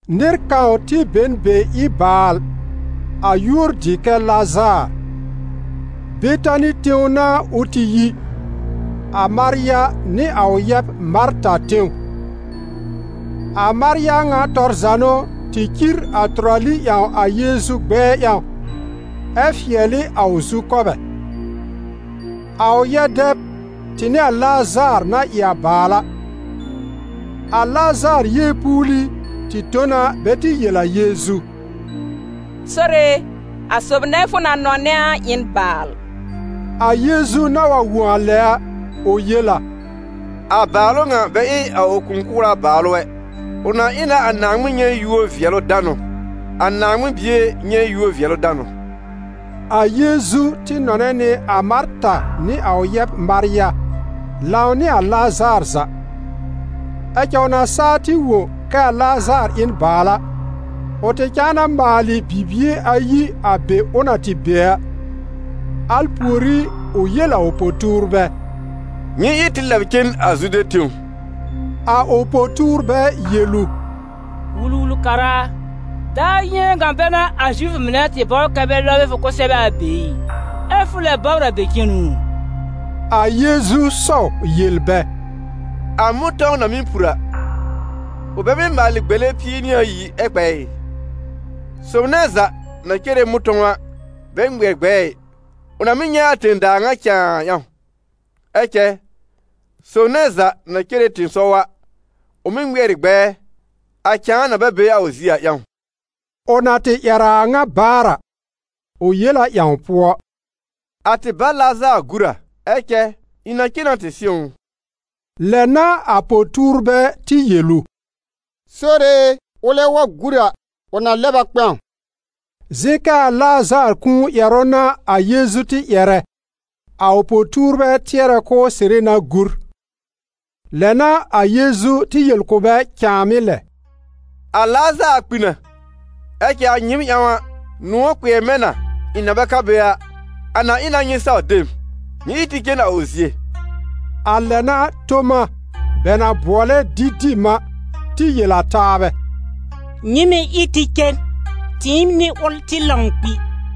Nɩr kãw tɩ be n be ɩ baal, a yúor dɩ kɛ Lazaar. Betani tẽw n'a ʋ tɩ yi, a Marya nɩ a ʋ yɛb Marta tẽw. A Marya ŋa tɔr za n'ʋ tɩ cir a tʋrali ƴãw a Yeezu gbɛɛ ƴãw, ɛ fɩɛl ɩ a ʋ zukɔbɛ; a ʋ yɛ-dɛb tɩ n'ɩ a Lazaar na ɩ a baal a. A Lazaar yeepuuli tɩ tõ na bɛ tɩ yel a Yeezu: «Sore e, a sob nɛ fʋ na nɔnɛ a ɩ n baal.» A Yeezu na wa wõ a lɛ a, ʋ yel a: «A bàalʋ ŋa bɛ ɩ a ʋ kũu-kʋra bàalʋ ɛ, ʋ na ɩ na a Naaŋmɩn nyɛ̃ yúor-vɩɛlʋ-danʋ, a Naaŋmɩn Bie nyɛ̃ yúor-vɩɛlʋ-danʋ.» A Yeezu tɩ nɔnɛ nɩ a Marta nɩ a ʋ yɛb Marya, lãw nɩ a Lazaar za. Ɛ cɛ ʋ na saa tɩ wõ kɛ a Lazaar ɩ n baal a, ʋ tɩ cãa na maalɩ bibie ayi a be ʋ na tɩ be a. Al pùorí, ʋ yel a ʋ po-tuurbɛ: «Nyɩ ɩ tɩ lɛb cen a Zude tẽw.» A ʋ po-tuurbɛ yel ʋ: «Wul-wul-kara a, daar yɩ̃ɛ ŋa bɛ n'a a Zifʋ mɩnɛ tɩ bɔbr kɛ́ bɛ lɔb ɩ fʋ kʋsɛbɛ a be ɩ, ɛ́ fʋ lɛ bɔbr a be cenu u?» A Yeezu sɔw yel bɛ: «A mʋ̃tɔ̃w na mɩ́ pur a, ʋ bɛ mɩ́ maalɩ gbele pie nɩ ayi ɛ kpɛ ɩ? Sob nɛ za na cere mʋ̃tɔ̃w a bɛ ŋmɩɛr gbɛɛ ɩ, ʋ na mɩ́ nyɛ̃ a tẽ-daa ŋa cãa a ƴãw. Ɛ cɛ sob nɛ za na cere tɩ̃ɩsɔw a, ʋ mɩ́ ŋmɩɛr ɩ gbɛɛ, a cãa na bɛ be a ʋ zie a ƴãw.» Ʋ na tɩ ƴɛr a a ŋa baar a, ʋ yel a ƴãw pʋɔ: «A tɩ bá Lazaar gúr a, ɛ cɛ ɩ̃ na cen na tɩ sɩ̃w ʋ.» Lɛ n'a a po-tuurbɛ tɩ yel ʋ: «Sore e, ʋlɛ wa gúr a, ʋ na lɛb a kpɛ̃w.» Zɩ̃ kɛ a Lazaar kũu ƴɛrʋ n'a a Yeezu tɩ ƴɛrɛ, a ʋ po-tuurbɛ tɩɛrɛ k'ʋʋ sɩrɩ na gúr. Lɛ n'a a Yeezu tɩ yel kʋ̀ bɛ cãàmɩ́ lɛ: «A Lazaar kpi na, ɛ cɛ a nyɩɩm ƴãw a, nʋ̃ɔ̀ kpɩɛr mɛ̃ na ɩ̃ na bɛ ka be a, a na ɩ na nyɩ saw de m. Nyɩ ɩ tɩ cen a ʋ zie.» A lɛ n'a Toma, bɛ na bʋɔlɛ Didim a, tɩ yel a taabɛ: «Nyɩ mɩ̀ ɩ tɩ cen, tɩɩm nɩ ʋl tɩ lãw kpi!»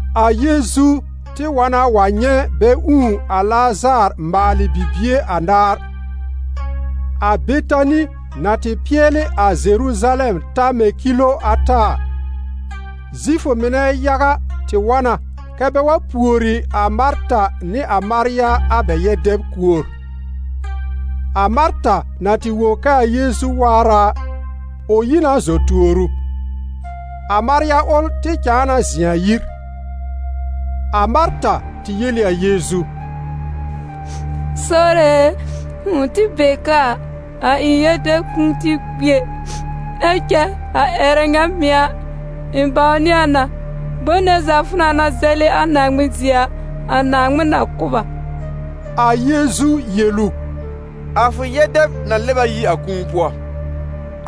A Yeezu tɩ wa na wa nyɛ̃ bɛ ũù a Lazaar maalɩ bibie anaar. A Betani na tɩ pɩɛlɩ a Zeruzalɛm ta mɛ̃ kilo ata a, Zifʋ mɩnɛ yaga tɩ wa na kɛ́ bɛ wa pùori a Marta nɩ a Marya a bɛ yɛ-dɛb kuor. A Marta na tɩ wõ kɛ a Yeezu waar a, ʋ yi na zɔ tuor ʋ. A Marya ʋl tɩ cãa na zɩ̃ a yir. A Marta tɩ yel ɩ a Yeezu: «Sore e, fʋ̃ʋ tɩ be ka a, a ɩ̃ yɛ-dɛb kʋ̃ʋ tɩ kpi ɛ. Ɛ cɛ a ƴɛrɛ ŋa mɩ̀ a, ɩ̃ bãwnɩ a na, bom nɛ za fʋ na na zɛlɩ a Naaŋmɩn zie a, a Naaŋmɩn na kʋ̀ b a.» A Yeezu yel ʋ: «A fʋ yɛ-dɛb na lɛb a yi a kũu pʋɔ.»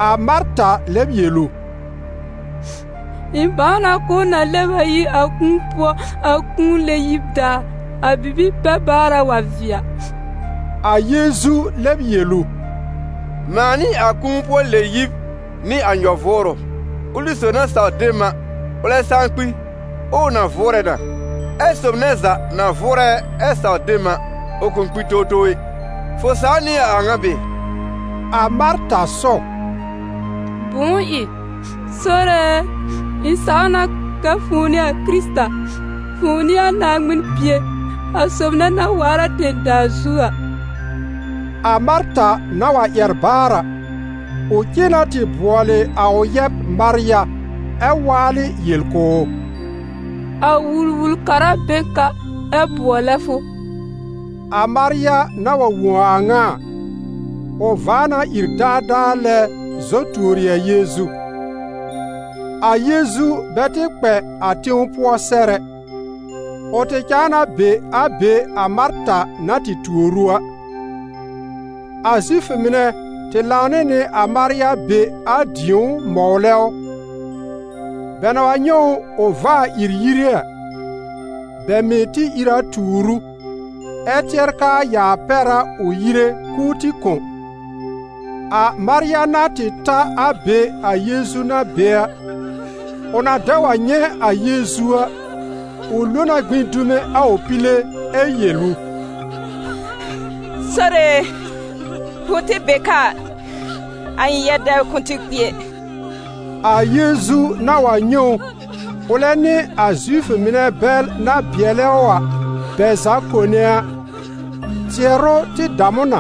A Marta lɛb yel ʋ: «Ɩ̃ bãw na k'ʋʋ na lɛb a yi a kũu pʋɔ a kũu-pʋɔ-lɛ-yib daar, a bibi-pɛ-baara wa vɩɛ a.» A Yeezu lɛb yel ʋ: «Mãa n'ɩ a Kũu-pʋɔ-lɛ-yib nɩ a Nyɔ-vʋʋrʋ. Ʋlɩ sob na saw de m a, ʋlɛ saa kpi, ɛ ʋ na vʋʋrɛ na; ɛ sob nɛ za na vʋʋrɛ ɛ saw de m a, ʋ kʋ̃ kpi towtow ɛ. Fʋ saw nɩ a a ŋa bɩɩ?» A Marta sɔw: «Bʋ̃ʋ ɩ? Sore e, ɩ̃ saw na kɛ fʋ̃ʋ n'ɩ a Kɩrɩta, fʋ̃ʋ n'ɩ a Naaŋmɩn Bie, a sob nɛ na waar a tẽ-daa zu a.» A Marta na wa ƴɛr baar a, ʋ cen na tɩ bʋɔlɩ a ʋ yɛb Marya ɛ waalɩ yel kʋ̀ ʋ: «A Wul-wul-kara be n ka, ɛ bʋɔlɛ fʋ.» A Marya na wa wõ a a ŋa a, ʋ vaa na ìr daadaa lɛ zɔ tuori a Yeezu. A Yeezu bɛ tɩ kpɛ a tẽw pʋɔ sɛr ɛ, ʋ tɩ cãa na be a be a Marta na tɩ tuor ʋ a. A Zifʋ mɩnɛ tɩ lãw nɩ nɩ a Marya be a dĩ̀ó mɔwlɛ ʋ. Bɛ na wa nyɛ̃ ʋ ʋ vaa ìr yire a, bɛ mɩ̀ tɩ ìr a tuur ʋ, ɛ tɩɛr kɛ a yaa pɛr a ʋ yire k'ʋʋ tɩ kõ. A Marya na tɩ ta a be a Yeezu na be a, ʋ na dɛ wa nyɛ̃ a Yeezu a, ʋ lo na gbĩ dume a ʋ pile ɛ yel ʋ: «Sore e, fʋ̃ʋ tɩ be ka a, a ɩ̃ yɛ-dɛb kʋ̃ʋ tɩ kpi ɛ.» A Yeezu na wa nyɛ̃ ʋ, ʋlɛ nɩ a Zifʋ mɩnɛ bɛl na bɩɛlɛ ʋ a, bɛ za kone a, tɩɛrʋ tɩ dam ʋ na,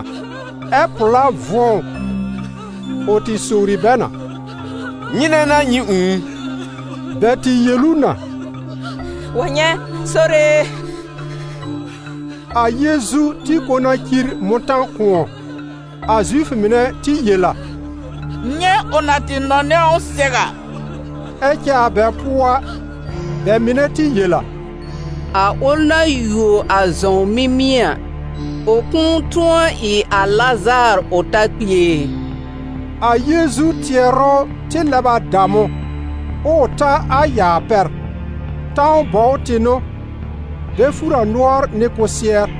ɛ́ pʋ̀lá vʋ̃ɔ ʋ. Ʋ tɩ sowri bɛ na: «Nyɩnɛ n'a nyɩ ũù ʋ?» Bɛ tɩ yel ʋ na: «Wa nyɛ̃, Sore e.» A Yeezu tɩ kõ na cir mʋ̃tã-kʋ̃ɔ. A Zifʋ mɩnɛ tɩ yel a: «Nyɛ̃ ʋ na tɩ nɔnɛ ʋ sɛw a!» Ɛ cɛ a bɛ pʋɔ a, bɛ mɩnɛ tɩ yel a: «A ʋl na yuo a zɔ̃w mimie a, ʋ kʋ̃ʋ tʋ̃ɔ ɩ a Lazaar ʋ ta kpi ɛ?» A Yeezu tɩɛrʋ tɩ lɛb a dam ʋ, ɛ ʋ ta a yaa pɛr. Tãw bɔw tɩ n'ʋ, bɛ fùr a nʋɔr nɩ kʋsɩɛr.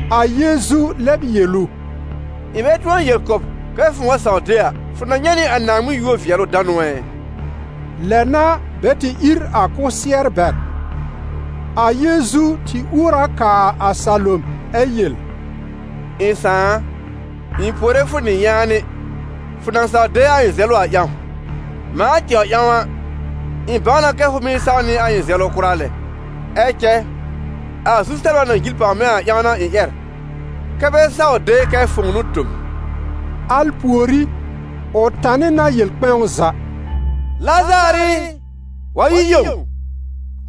A Yeezu lɛb yel ʋ: «Ɩ̃ bɛ tʋ̃ɔ yel kʋ̀ b, kɛ́ fʋ̃ʋ wa saw de a, fʋ na nyɛ̃ nɩ a Naaŋmɩn yúor-vɩɛlʋ-danʋ ɛ?» Lɛ n'a bɛ tɩ ír a kʋsɩɛr bɛr. A Yeezu tɩ uor a kaa a salom, ɛ yel: «Ɩ̃ Sãà a, ɩ̃ puore fʋ nɩ yaanɩ, fʋ na saw de a ɩ̃ zɛlʋ a ƴãw. Mãa tɛwr ƴãw a, ɩ̃ bãw na kɛ fʋ mɩ́ saw nɩ a ɩ̃ zɛlʋ kʋra lɛ. Ɛ cɛ a zu-sɛbla na jil pàw mɛ̃ a ƴãw n'a ɩ̃ ƴɛr, kɛ́ bɛ saw de kɛ fʋ̃ʋ n'ʋ tõ m.» Al pùorí, ʋ tanɩ na yel kpɛ̃w za: «Lazaar ɩ, wa yi yẽw!»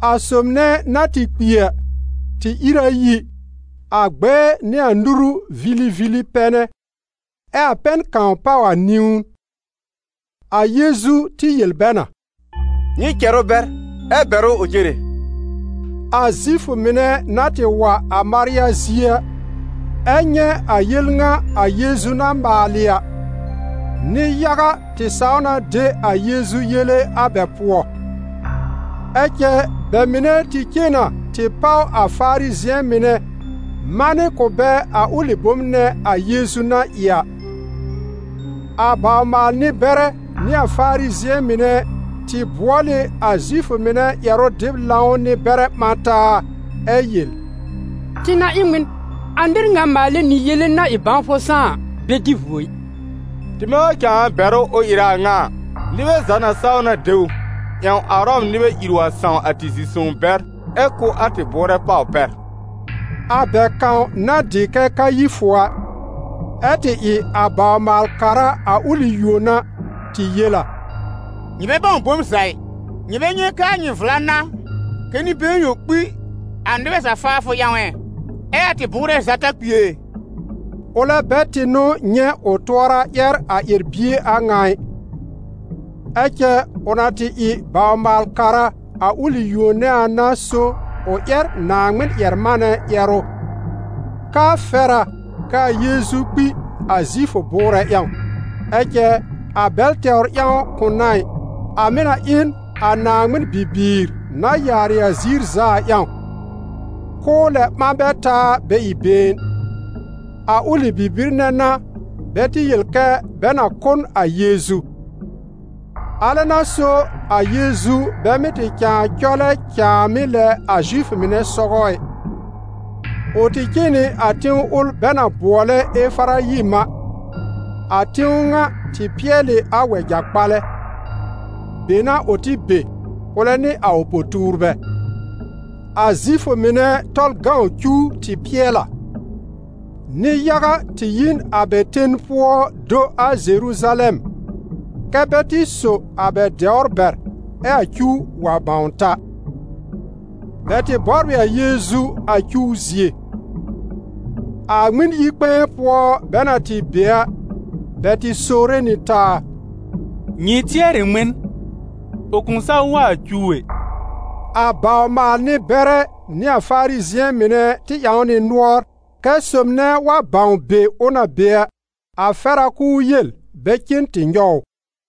A sob nɛ na tɩ kpi a, tɩ ír a yi, a gbɛɛ nɩ a nuru vilivili pɛnɛ, ɛ a pɛn kãw páw a niwn. A Yeezu tɩ yel bɛ na: «Nyɩ cɛr ʋ bɛr, ɛ bɛr ʋ ʋ cere.» A Zifʋ mɩnɛ na tɩ wa a Marya zie a, ɛ nyɛ̃ a yel ŋa a Yeezu na maalɩ a, nɩ-yaga tɩ saw na de a Yeezu yele a bɛ pʋɔ. Ɛ cɛ bɛ mɩnɛ tɩ cen na tɩ páw a Farizɩ̃ɛ mɩnɛ manɩ kʋ̀ bɛ a ʋlɩ bom nɛ a Yeezu na ɩ a. A bawr-maal-nɩ-bɛrɛ nɩ a Farizɩ̃ɛ mɩnɛ tɩ bʋɔl ɩ a Zifʋ mɩnɛ ƴɛrʋ-dɩb-lãw nɩ-bɛrɛ ɓã taa ɛ yel: «Tɩ na ɩ n ŋmɩn? A nɩr ŋa maalɛ nɩ yele-na-ɩ-bãwfʋ-sãá a, bɛ dɩ vuo ɩ, tɩmɛ wa cãa bɛr ʋ ʋ ɩrɛ a ŋa a, nɩbɛ za na saw na de ʋ, ƴãw a Ʋrɔm nɩbɛ ìr wa sãw a tɩ zi-sõw bɛr, ɛ kʋ́ a tɩ bʋʋrɛ pàw pɛr.» A bɛ kãw na dɩ kɛ Kayifʋ a, ɛ tɩ ɩ a bawr-maal-kara a ʋlɩ yuon a, tɩ yel a: «Nyɩ bɛ bãw bom za ɩ! Nyɩ bɛ nyɛ̃ kɛ a nyɩ vla n'a kɛ nɩ-been yõ kpi a nɩbɛ za faafʋ ƴãw ɛ, ɛ a tɩ bʋʋrɛ za ta kpi ɛ?» Ʋlɛ bɛ tɩ n'ʋ nyɛ̃ ʋ tʋɔra ƴɛr a ƴɛr-bie a ŋa ɩ; ɛ cɛ ʋ na tɩ ɩ bawr-maal-kara a ʋlɩ yuon nɛ a n'a so ʋ ƴɛr Naaŋmɩn-ƴɛr-manɛ ƴɛrʋ, k'aa fɛr a kɛ a Yeezu kpi a Zifʋ bʋʋrɛ ƴãw. Ɛ cɛ a bɛl tɛwr ƴãw kʋ̃ n'a ɩ, a mɩ̀ na ɩ n a Naaŋmɩn bibiir na yaarɩ a ziir za a ƴãw, k'ʋʋ lɛ ɓã bɛ taa bɛ ɩ been. A ʋlɩ bibir nɛ n'a bɛ tɩ yel kɛ bɛ na kʋ́ n a Yeezu. Alɛ n'a so a Yeezu bɛ mɩ́ tɩ cãa cɔlɛ cãàmɩ́ lɛ a Zifʋ mɩnɛ sɔgɔ ɛ: ʋ tɩ cen nɩ a tẽw ʋl bɛ na bʋɔlɛ Efarayim a, a tẽw ŋa tɩ pɩɛl ɩ a wɛja-kpalɛ. Be n'a ʋ tɩ be, ʋlɛ nɩ a ʋ po-tuurbɛ. A Zifʋ mɩnɛ Tɔlʋ cuw tɩ pɩɛl a. Nɩ-yaga tɩ yi n a bɛ ten pʋɔ do a Zeruzalɛm, kɛ́ bɛ tɩ so a bɛ dɛwr bɛr ɛ a cuw wa bãw ta. Bɛ tɩ bɔbr ɩ a Yeezu a cuw zie. A Ŋmɩn-yi-kpɛ̃ɛ pʋɔ bɛ na tɩ be a, bɛ tɩ sowre nɩ taa: «Nyɩ tɩɛr ɩ ŋmɩn? Ʋ kʋ̃ saw wa a cuw ɛ!» A bawr-maal-nɩ-bɛrɛ nɩ a Farizɩ̃ɛ mɩnɛ tɩ ƴãw nɩ nʋɔr, kɛ́ sob nɛ wa bãw be ʋ na be a, a fɛr a k'ʋʋ yel bɛ cen tɩ nyɔw ʋ.